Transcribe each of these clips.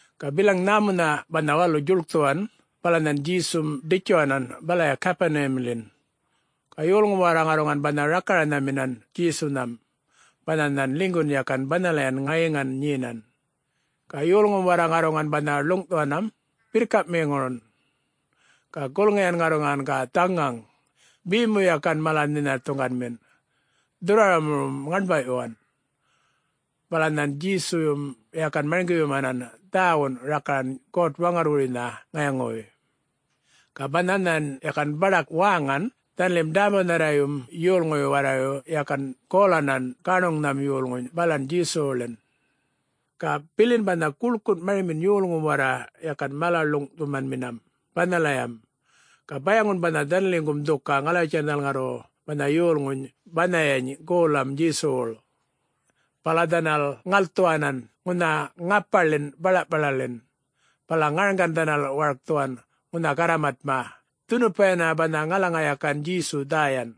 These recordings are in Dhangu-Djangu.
Ga bilaŋ nhämunhaꞌ banha walu djuḻkthuwan, bala nhan Djesum ḏitjuwanan balaya Gapuniyamḻin. Ga yolŋum warra ŋarruŋan banha rakaranhaminan Djesunham banha nhan ḻinygun yakan banhalayan ŋayiŋan nyenan. Ga yolŋum warra ŋarruŋan banha ḻuŋꞌthuwanam birrkamiŋurun. Ga gulŋiyan ŋarruŋan ga dhaŋaŋ, be mu yakan mala nhinathuŋganmin, dhurrwaramurrum ŋaṉbawꞌyuwan. Bala nhan Djesuyum yakan marŋgiyumanan dhäwun rakaran God-Waŋarrwuruynha ŋayaŋuwuy. Ga banha nhan yakan baḏak wäŋan, dhanalim ḏämbunharrayum yolŋuyu warrayu yakan golanan gaṉuŋnham yolŋuny balan Djesuwuḻin. Ga bilin banha guḻkun marimin yolŋum warra yakan mala-ḻuŋꞌthumanminam banhalayam, ga bayaŋun banha dhanaliŋgum dhuka ŋalawitjan dhanal ŋarru banha yolŋuny banhayany goḻam Djesuwuḻ. Bala dhanal ŋalthuwanan ŋunha ŋapaḻin balaꞌpalaḻin, bala ŋarŋgan dhanal warkthuwan ŋunha garramatma dhunupa yana banha ŋalaŋa yakan Djesu dhäyan.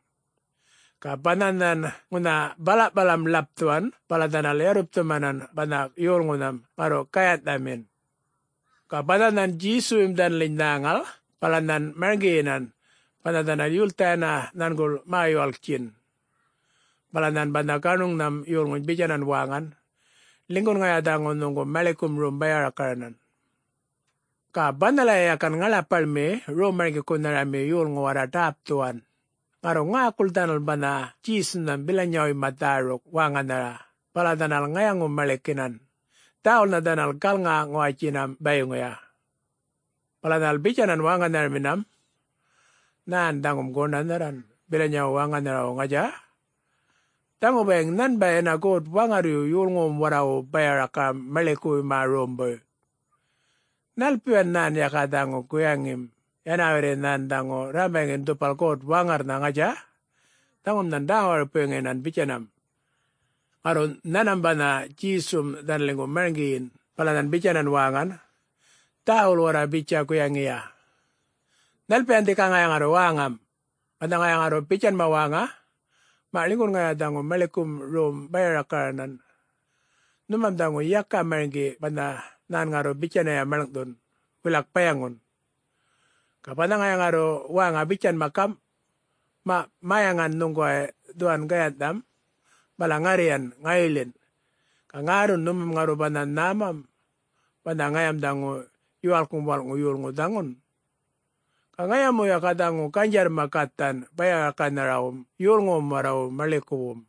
Ga banha nhan ŋunha balaꞌpalam ḻapthuwan, bala dhanal yarrupthumanan banha yolŋunham ŋarru gayanhꞌthamin. Ga banha nhan Djesuyum dhanaliny nhäŋal bala nhan marŋgiyinan banha dhanal yultha yana nhanguḻ mä-yuwalkin. Bala nhan banha gaṉuŋnham yolŋuny bitjanan wäŋan, “Ḻinygun ŋaya dhaŋu nhuŋgu maḻikum rom baya-rakaranan.” Ga banhalaya yakan ŋaḻapaḻmi Rom-marŋgikunhami yolŋu warra ḏäpthuwan, ŋarru ŋäkul dhanal banha Djesunham bilanyawuyma dhäruk wäŋanhara bala dhanal ŋayaŋu-maḻikinan, dhäwulnha dhanal galŋa-ŋuwatjinam bayiŋuya. Bala dhanal bitjanan wäŋanharaminam, “Nhä dhaŋum, goṉanharran bilanyawum wäŋanharawu, ŋatja? Dhaŋu bayiŋ nhanbay yana God-Waŋarryu yolŋuwum warrawu baya-rakaram maḻikuwuyma rombuy. Nhalpiyan nhan yaka dhaŋu guyaŋim, yana warri nhan dhaŋu rrambaŋin dhupal God-Waŋarrnha, ŋatja? Dhaŋum nhan dhä-waripuŋuyinan bitjanam!” Ŋarru nhanmam banha Djesum dhanaliŋgu marŋgiyin bala nhan bitjanan wäŋan, “Dhäwul warra bitja guyaŋiya! Nhalpiyan dhika ŋaya ŋarru wäŋam? Banha ŋaya ŋarru bitjanma wäŋa, ‘Maꞌ, ḻinygun ŋaya nhuŋgu maḻikum rom baya-rakaranan’, nhumam dhaŋu yaka marŋgi banha nhan ŋarru bitjanya maḻŋꞌthun, wilak bayaŋun. Ga banha ŋaya ŋarru wäŋa bitjanma gamꞌ, ‘Maꞌ mäyaŋan nhuŋguway dhuwan gayanhꞌtham bala ŋarryan ŋayiḻin’, ga ŋärrun nhuma ŋarru banha nhämam banha ŋayam dhaŋu Yuwalkŋum Walꞌŋu Yolŋu dhaŋun. Ga ŋaya mu yaka dhaŋu ganydjarrma gathan baya-rakaranhawum yolŋuwum warrawu maḻikuwum.”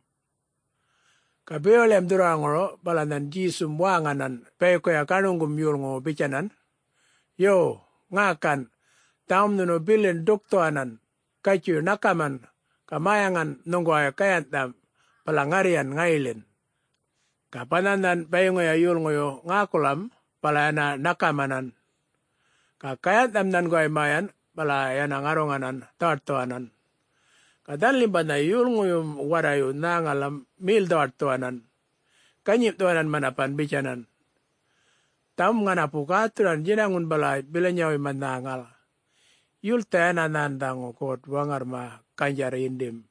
Ga bewaḻiyam dhurrwaraŋuru bala nhan Djesum wäŋanan bayikuya gaṉuŋgum yolŋuwu bitjanan, “Yo, ŋäkan! Dhaŋum nhunu bilin ḏukthuwanan, gatjuy ṉakaman ga mäyaŋan nhuŋguway gayanhꞌtham bala ŋarryan ŋayiḻin.” Ga banha nhan bayiŋuya yolŋuyu ŋäkulam bala yana ṉakamanan. Ga gayanhꞌtham nhanguway mäyan bala yana ŋarruŋanan dhawaṯthuwanan. Ga dhanalim banha yolŋuyum warrayu nhäŋalam mel-dhawaṯthuwanan, ganyimꞌthuwanan manapan bitjanan, “Dhaŋum ŋanapu gäthuran djinaŋun bala bilanyawuyma nhäŋal. Yultha yana nhan dhaŋu God-Waŋarrma ganydjarr yindim!”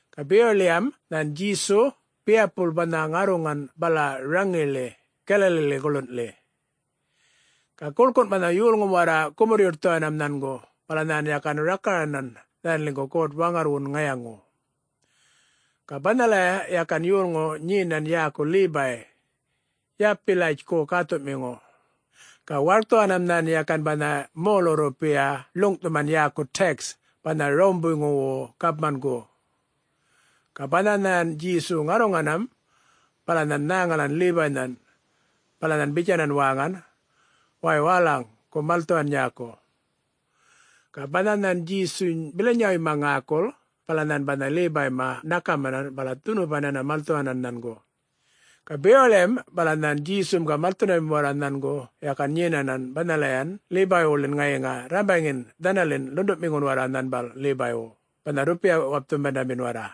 Ga bewaḻiyam nhan Djesu biyapul banha ŋarruŋan bala raŋiḻi Galaliḻi guḻunḻi. Ga guḻkun banha yolŋum warra gumurr-yuṯthuwanam nhangu bala nhan yakan rakaranan dhanaliŋguḻ God-Waŋarrwun ŋayaŋu. Ga banhalaya yakan yolŋu nyenan yäku Lebay, Yalpiyatjku gäthuꞌmiŋu. Ga warkthuwanam nhan yakan banha molu-rrupiya ḻuŋꞌthuman yäku tax, banha Rawumbuywu gapmangu. Ga banha nhan Djesu ŋarruŋanam, bala nhan nhäŋalan Lebaynhan. Bala nhan bitjanan wäŋan, “Wäy wälaŋ, gu malthuwan nyäku!” Ga banha nhan Djesuny bilanyawuyma ŋäkul, bala nhan banha Lebayma ṉakamanam bala dhunupan yana malthuwanan nhangu. Ga bewaḻiyam bala nhan Djesum ga malthundamim warra nhangu yakan nyenan banhalayan Lebaywuḻin ŋayiŋa rrambaŋin dhanalin ḻunduꞌmiŋun warra nhanbal Lebaywu banha rrupiya-wapthumandamin warra.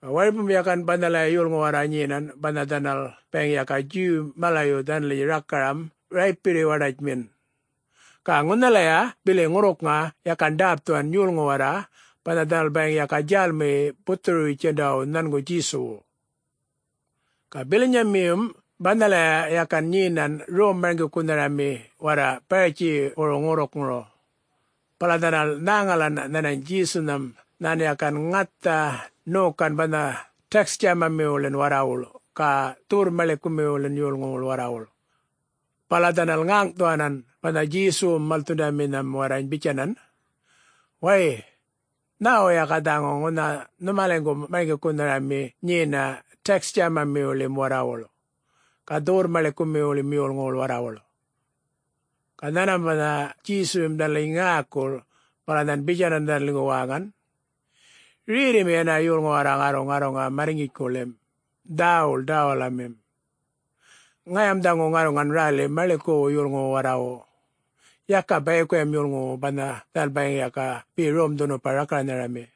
Ga waripum yakan banhalaya yolŋu warra nyenan banha dhanal bayiŋ yaka Djuw malayu dhanaliny rakaram raypirri-waḏatjmin. Ga ŋunhalaya bili ŋurrukŋa yakan ḏäpthuwan yolŋu warra banha dhanal bayiŋ ga djälmiyi buthuru-bitjundawu nhangu Djesuwu. Ga bilanyamiyum banhalaya yakan nyenan rom-marŋgikunhami warra Baratjiwuru ŋurrukŋuru. Bala dhanal nhäŋalan nhanany Djesunham nhan yakan ŋatha ṉokan banha tax djämamiwuḻin warrawuḻ ga dhuwurr-maḻikumiwuḻin yolŋuwuḻ warrawuḻ. Bala dhanal ŋäŋꞌthuwanan banha Djesuwum malthundaminham warrany bitjanan, “Wäy! Nhäwu yaka dhaŋu ŋunha nhumaliŋgum marŋgikunhami nyena tax djämamiwuḻim warrawuḻ, ga dhuwurr-maḻikumiwuḻim yolŋuwuḻ warrawuḻ?” Ga nhanmam banha Djesuyum dhanaliny ŋäkul, bala nhan bitjanan dhanaliŋgu wäŋan, “Rerrimi yana yolŋu warra ŋarru ŋarruŋa marrŋgitjkuḻim, dhäwul ḏäwalamim. Ŋayam dhaŋu ŋarruŋan räli maḻikuwu yolŋuwu warrawu, yaka bayikuyam yolŋuwu banha dhanal bayiŋ ga be rom-dhunupa rakaranhami.”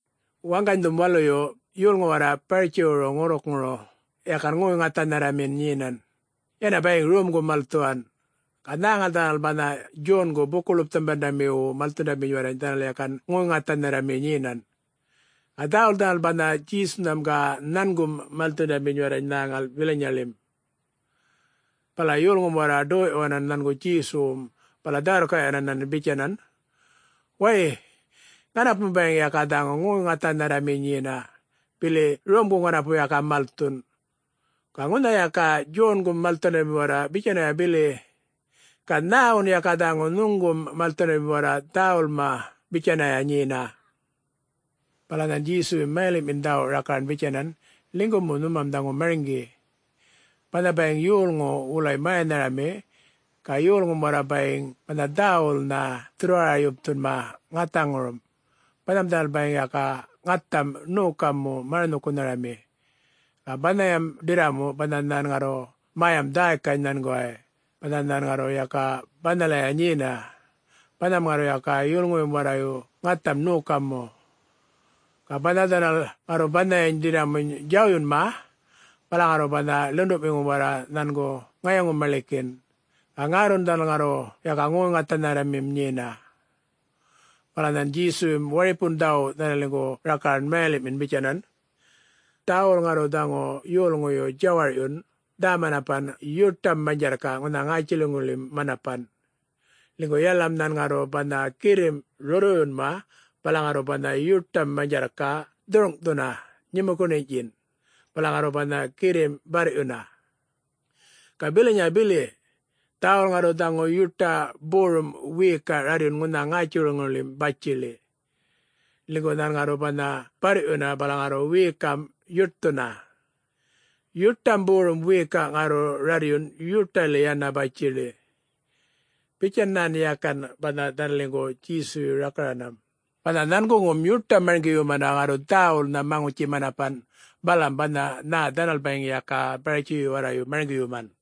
Waŋganydhum waluyu, yolŋu warra Baratjiŋuru ŋurrukŋuru yakan ŋoy-ŋathanharrami nyenan, yana bayiŋ romgun malthuwan. Ga nhäŋal dhanal banha Djongu Buku-ḻupthumandamiwu malthundaminy warrany dhanal yakan ŋoy-ŋathanharrami nyenan. Ga dhäwul dhanal banha Djesunham ga nhangum malthundaminy warrany nhäŋal bilanyaḻim. Bala yolŋum warra ḏoyꞌyuwanan nhangu Djesuwum bala dhä-wirrkaꞌyuwanan bitjanan, “Wäy, ŋanapum bayiŋ yaka dhaŋu ŋoy-ŋathanharrami nyena, bili romgu ŋanapu yaka malthun. Ga ŋunha yaka Djongum malthundami warra bitjanaya bili. Ga nhäwun yaka dhaŋu nhuŋgum malthundami warra dhäwulma bitjanaya nyena?” Bala nhan Djesuyum mayaḻiꞌmin dhäwu rakaran bitjanan, “Ḻinygu mu nhumam dhaŋu marŋgi: banha bayiŋ yolŋu wulay mäyanharami ga yolŋum warra bayiŋ banha dhäwulnha dhurrwara-yapthunma ŋathaŋurum, banham dhanal bayiŋ ga ŋatham ṉoka mu maranhuyumanmi. Ga banhayam ḏirramu banha nhan ŋarru mäyam dhäykany nhanguway, banha nhan ŋarru yaka banhalaya nyena, banham ŋarru yaka yolŋuyum warrayu ŋatham ṉoka mu. Ga banha dhanal ŋarru banhayany ḏirramuny djawyunma, bala ŋarru banha ḻunduꞌmiŋum warra nhangu ŋayaŋu-maḻikin, ga ŋärrun dhanal ŋarru yaka ŋoy-ŋathanharramim nyena.” Bala nhan Djesuyum waripun dhäwu dhanaliŋgu rakaran mayaliꞌmin bitjanan, “Dhäwul ŋarru dhaŋu yolŋuyu djawarꞌyun dhä-manapan yuṯam manydjarrkaꞌ ŋunha ŋätjiliŋuḻim manapan. Ḻinygu yalalam nhan ŋarru banha girrimꞌ rurrwuyunma bala ŋarru banha yuṯam manydjarrkaꞌ dhurŋꞌthuna nyumukuṉinyꞌtjin, bala ŋarru banha girrimꞌ barryuna. Ga bilanya bili: dhäwul ŋarru dhaŋu yuṯa borum wiyikaꞌ rarryun ŋunha ŋätjiliŋuḻim batjiḻi, ḻinygu nhan ŋarru banha barryuna bala ŋarru wiyikamꞌ yuṯthuna. Yuṯam borum wiyikaꞌ ŋarru rarryun yuṯaḻi yana batjiḻi.” [Bitjan nhan yakan banha dhanaliŋgu Djesuyu rakaranam, banha nhanguŋum yuṯam marŋgiyumanda ŋarru dhäwulnha maŋutji-manapan balam banha nhä dhanal bayiŋ yaka Baratjiyu warrayu marŋgiyuman.]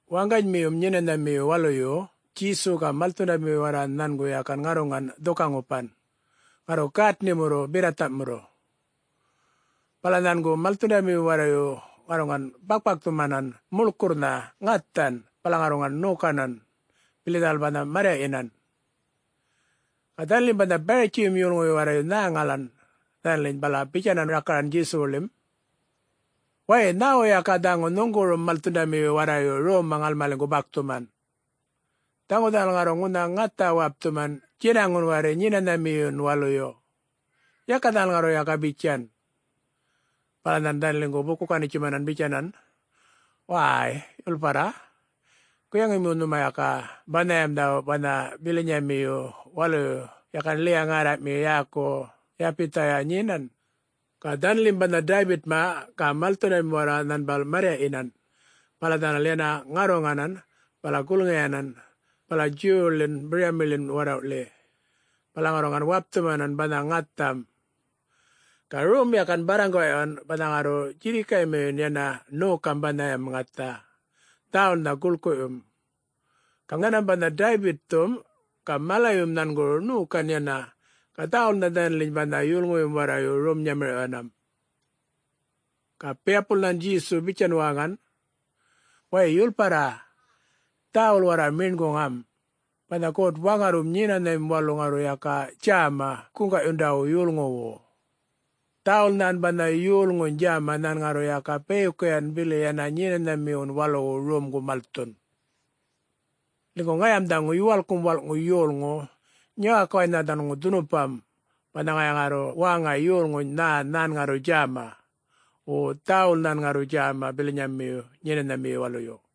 Waŋganymiyum Nyenanhamiyu Waluyu Djesu ga malthundami warra nhangu yakan ŋarruŋan dhuka-ŋupan, ŋarru gätnimurru berrathamurru. Bala nhangu malthundamiyum warrayu ŋarruŋan bakpakthumanan muḻkurrnha ŋathan bala ŋarruŋan ṉokanan, bili dhanal banha marryaꞌyinan. Ga dhanalim banha Baratjiyum yolŋuyu warrayu nhäŋalan dhanaliny bala bitjanan rakaran Djesuwuḻim, “Wäy! Nhäwu yaka dhaŋu nhuŋgurum malthundamiyu warrayu romma ŋalmaliŋgu bakthuman? Dhaŋu dhanal ŋarruŋ ŋunha ŋathan wapthuman djinaŋun warri Nyenanhamiyun Waluyu. Yaka dhanal ŋarru yaka bitjan!” Bala nhan dhanaliŋgu buku-ganitjuman, bitjanan, “Wäy, yulparra, guyaŋi mu nhuma yaka banhayam dhäwu banha bilinyamiyu waluyu yakan Ḻiya-ŋärraꞌmi yäku Yabithaya nyenan. Ga dhanalim banha Daybitma ga malthundamim warra nhanbal marryaꞌyinan, bala dhanal yana ŋarruŋanan bala gulŋiyanan bala Djuwwuḻin biryamiḻin warrawꞌḻi, bala ŋarruŋan wapthumanan banha ŋatham. Ga rom yakan barraŋgaꞌyuwan banha ŋarru djirrikaymiyun yana ṉokam banhayam ŋatham, dhäwulnha gulkuꞌyum. Ga nhanmam banha Daybitthum ga malayum nhanguru ṉokan yana, ga dhäwulnha dhanaliny banha yolŋuyum warrayu rom-nyamirꞌyuwan.” Ga biyapul nhan Djesu bitjan wäŋan, “Wäy yulparra, dhäwul warra meṉguŋam, banha God-Waŋarrwum Nyenanhamim Walu ŋarru yaka djäma guŋgaꞌyundawu yolŋuwu. Dhäwul nhan banha yolŋuny djäma nhan ŋarru yaka bayikuyan bili yana Nyenanhamiwun Waluwu romgu malthun. Ḻinygu ŋayam dhaŋu Yuwaḻkŋum Walꞌŋu Yolŋu, nyäkuwaynha dhaŋu dhunupam banha ŋaya ŋarru wäŋa yolŋuny nhä nhan ŋarru djäma, wo dhäwul nhan ŋarru djäma bilanyayu Nyenanhamiyu Waluyu.”